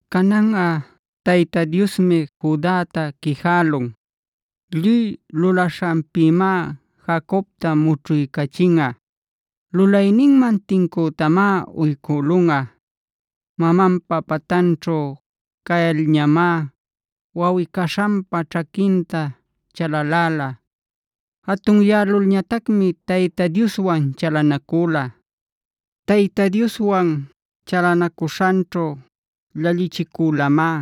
Cananꞌa Tayta Diosmi Judata quijälun. Lluy lulaśhanpïmá Jacobta mućhuycachinꞌa. Lulayninman tincütamá uycülunꞌa. Mamanpa pantanćhu cayalñamá wawꞌi-caśhanpa ćhaquinta chalaläla.a Jatunyälulñatacmi Tayta Dioswanb chalanacüla. Tayta Dioswan chalanacuśhanćhu llallichicülamá.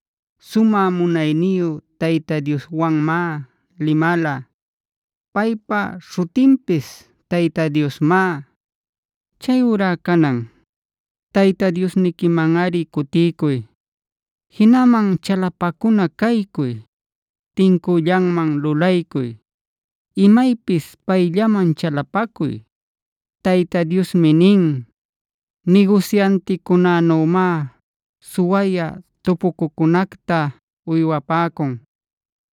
Sumä munayniyu Tayta Dioswanmá limala. Paypa śhutinpis Tayta Diosmá. Chayurá canan, Tayta Diosniquimanꞌari cutiycuy, jinaman chalapacuna caycuy, tincüllanman lulaycuy, imaypis payllaman chalapacuy. Tayta Diosmi nin: “Nigusyanticunänümá suwayä tupucucunacta uywapäcun.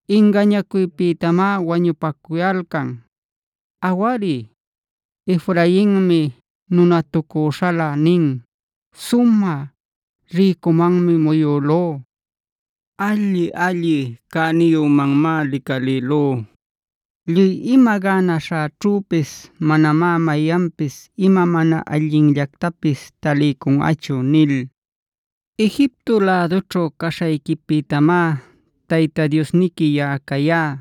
Ingañacuypïtamá wañupacuyalcan. Awari, Efrainmi nunatucüśhalä nin: ‘Sumä rïcumanmi muyülú. Alli-alli cänïyümanmá licalïlú. Lluy ima gänaśhäćhüpis manamá mayanpis ima mana allinllactapis taliycunꞌachu’ nil. Egipto lädućhu caśhayquipïtamá Tayta Diosniqui yaꞌa cayá.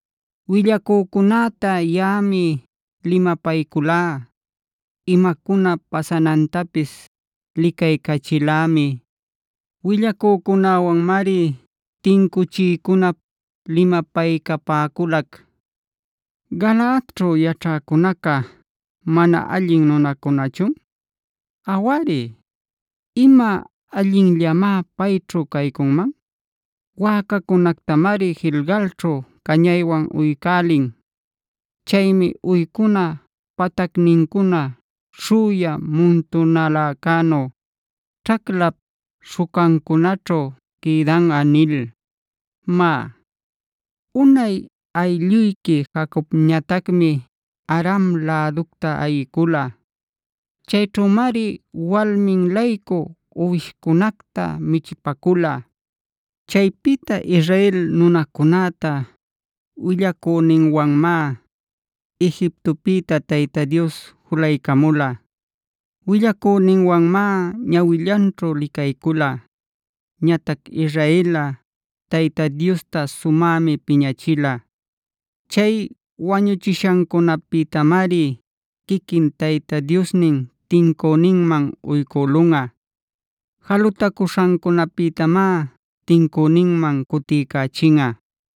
“Willacücunäta yaꞌami limapayculá. Imacuna pasanantapis licaycachilämi. Willacücunawanmari tincuchiycunap limapaycapäculac. “¿Galaadćhuf yaćhäcunaca mana allin nunacunachun? Awari, ¿ima allinllamá payćhu caycunman? Wäcacunactamari Gilgalćhug cañaywan uycälin. Chaymi uycuna patacnincuna śhüya muntunaläcänu ćhaclap śhucancunaćhu quïdanꞌa” nil. Má, unay aylluyqui Jacobñatacmi Aram läducta ayicula. Chayćhümari walmin-laycu uwishcunacta michipacula. Chaypïta Israel nunacunäta willacüninwanmá Egiptopïta Tayta Dios julaycamula.h Willacüninwanmá ñawillanćhu licaycula. Ñatac Israelꞌa Tayta Diosta sumämi piñachila. Chay wañuchishancunapïtamari quiquin Tayta Diosnin tincüninman uycülunꞌa. Jalutacuśhancunapïtamá tincüninman cutiycächinꞌa.